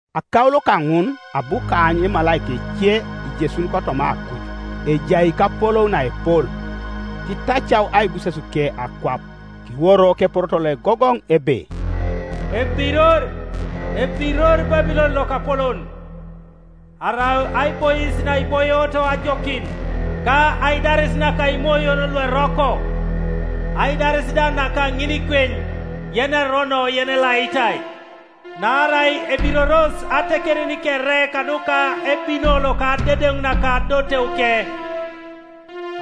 Akaulo kaŋun abu kaany emalaika ece ijesuni kotoma akuj, ejai kapolou naepol; kitacau aibusesuke akwap. Kiworo keporoto loegogoŋ ebe, “Ebiror, ebiror Babulon lokapolon! Arau aibois naiboioto ajokin, Ka aidaris naka imoyon lueroko, Aidaris da naka ŋinikweny yenerono yenelaitai; Naarai ebiroros atekerin kere kanuka ebino loka adedeŋ naka adoteuke,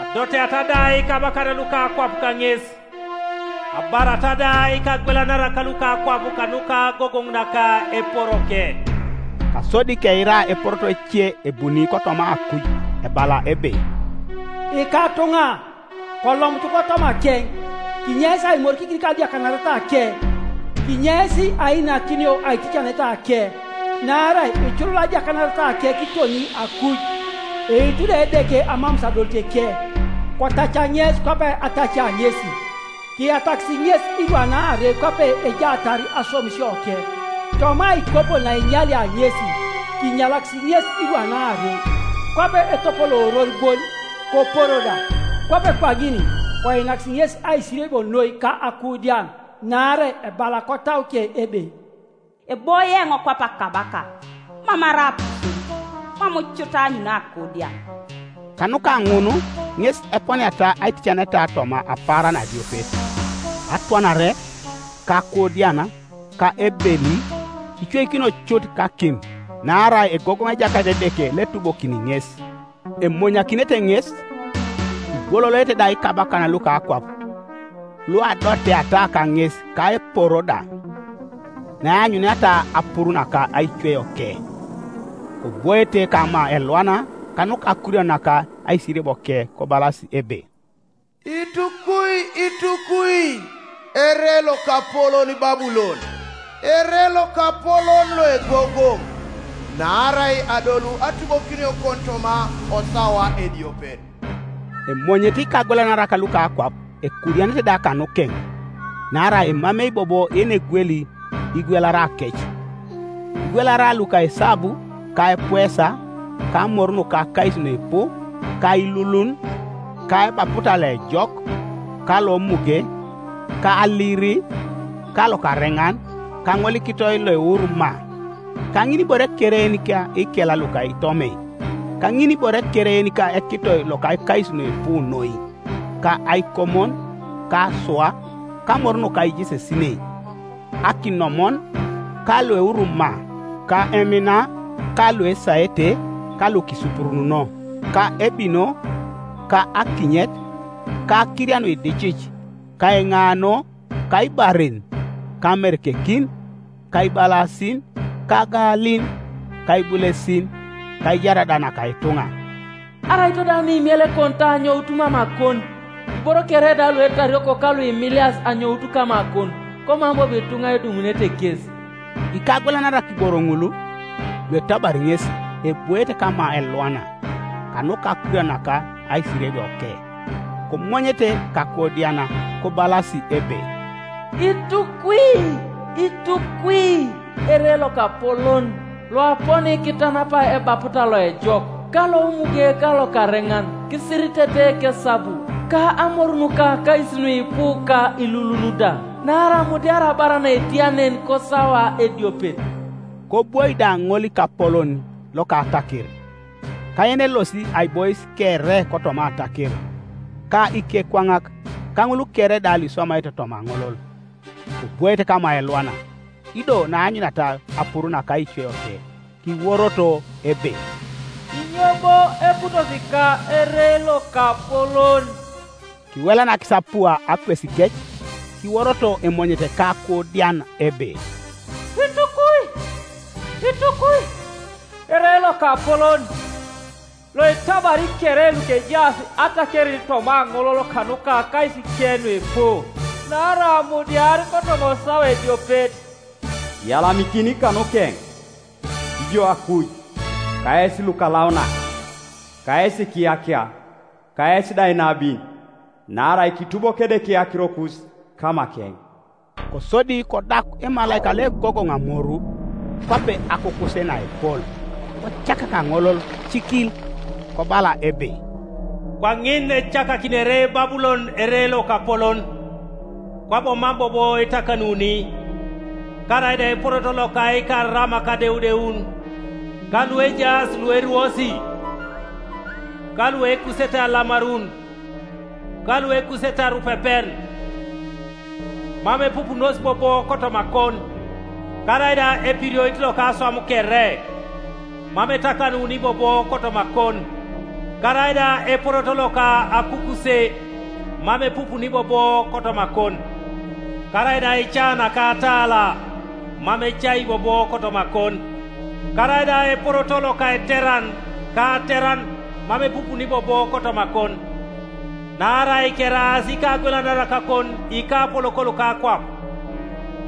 Adoteata da ikabakan luka akwap kaŋes, Abarata da ikagwelanarak luka akwap Kanuka agogoŋ naka eporoke.” Kasodi keira eporoto ece ebuni kotoma akuj ebala ebe, “Ikatuŋa, kolomutu kotomakeŋ, Kinyeis aimorikikin kadiakanaretake, Kinyeis ainakinio aiticanetake; Naarai iculul adiakanaretake kiton akuj, Eitu da Edeke amamus adoliteke. Kotaca ŋes kwape atacia ŋesi, Kiyatakis ŋes irwan aarei kwape ejaatar aswamisioke: Toma aikopo naenyalia ŋesi, kinyalakis ŋes irwan aarei. Kwape etopolooror bon, koporo da, Kwape kwaŋin koinakis ŋes aisiriebio noi ka akuudian, Naarai ebala kotauke ebe, ‘Eboie eoŋ kwape akabaka, Mam arai apuserut, mam cut aanyuni akuudian.’ Kanuka ŋun ŋes eponiata aiticanetake toma apaaran adiopet, Atwanare, ka akuudian, ka ebeli, Icweikinio cut kakim; Naarai egogoŋ Ejakait Edeke loetubokini ŋes.” Emonyakinete ŋes, ibwololoete da ikabakan luka akwap luadoteata kaŋes ka eporo da, naeanyuniata apuru naka aicweioke; kobwoete kama elwana, kanuka akurian naka aisiriebioke, kobalasi ebe, “Itukwi! Itukwi! Ere lokapolon, Babulon, ere lokapolon loegogoŋ! Naarai adolu atubokiniokon toma osawa ediopet.” Emonyete ikagwelanarak luka akwap, ekuudianete da kanukeŋ, naarai emamei bobo yenegweli igwelarakec, igwelara luka esabu, ka epuesa, ka amoru nuka akais nuipu, ka ilulun, ka ebaputa loejok, ka lomuge, ka aliri, ka lokareŋan, ka ŋolikitoi loeuru maa, ka ŋinibore kere yenika ikel luka itomei, ka ŋinibore kere yenika ekitoi loka akais nuipu noi, ka aikomon, ka asua, ka amor nuka ijesesinei, akinomon, ka lueuru maa, ka emina, ka luesaete, ka lukisupurununo, ka ebino, ka akinyet, ka akiria nuicidie, ka eŋano, ka ibaren, ka amerekekin, ka ibalasin, ka agalin, ka ibulesin, ka aijar da naka ituŋa. “Araito da nuimiela ekonitau anyout mamakon, Iboro kere da luetarioko ka luimilias anyout kamakon, Komam bobo ituŋa edumunete kes!” Ikagwelanarak iboro ŋul, luetabari ŋesi, ebwoete kama elwana, kanuka akurian naka aisiriebioke, komonyete ka akuudian, kobalasi ebe, “Itukwi! Itukwi! Ere lokapolon, Loaponi kitanapai ebaputa loejok, ka lomuge ka lokareŋan, Kisiritete kesabu, ka amor nuka akais nuipu, ka ilulun da! Naarai amudiar abar naetia nen kosawa ediopet.” Kobwoi da ŋolikapolon loka ataker, ka yenelosi aibois kere kotoma ataker, ka ikekwaŋak, ka ŋul kere da luiswamaete toma aŋolol, kobwoete kama elwana, ido naaanyuniata apuru naka aicweioke, kiworoto ebe, “Inyo bo eputosi ka ere lokapolon?” Kiwelanakis apua akwesikec, kiworoto emonyete ka akuudian ebe, “Itukwi! Itukwi! Ere lokapolon, Loetabari kere lukejaas atakerin toma aŋolol kanuka akaisike nuipu! Naarai amudiar kotoma osawa ediopet. Kiyalamikin kanukeŋ, ijo akuj, Ka yes lukalaunak, ka yes ikiyakia, ka yes da inabin, Naarai kitubok Edeke akirokus kamakeŋ!” Kosodi kodak emalaika loegogoŋ amoru, kwape akukuse naepol, kocakak aŋolol cikil, kobala ebe, “Kwaŋin ecakakinere Babulon ere lokapolon, Kwabo mam bobo etakanuni. Karaida eporoto loka ikaramak adeudeun, ka luejaas lueruosi, ka luekusete alamarun, ka luekusete arupepen, Mam epupunos bobo kotomakon. Karaida epirioit loka aswam kere, mam etakanuni bobo kotomakon; Karaida eporoto loka akukuse mam epupuni bobo kotomakon; Karaida aica naka atala, mam ecai bobo kotomakon; Karaida eporoto loka eteran ka ateran mam epupuni bobo kotomakon; Naarai keraas ikagwelanarakakon ikapolok luka akwap,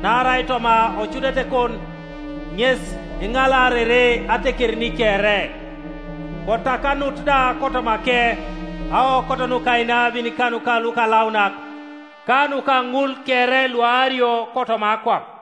Naarai toma ocudetekon ŋes eŋalaarere atekerin kere. Kotakanut da kotomake aokot nuka inabin ka nuka lukalaunak, Ka nuka ŋul kere luaario kotoma akwap.”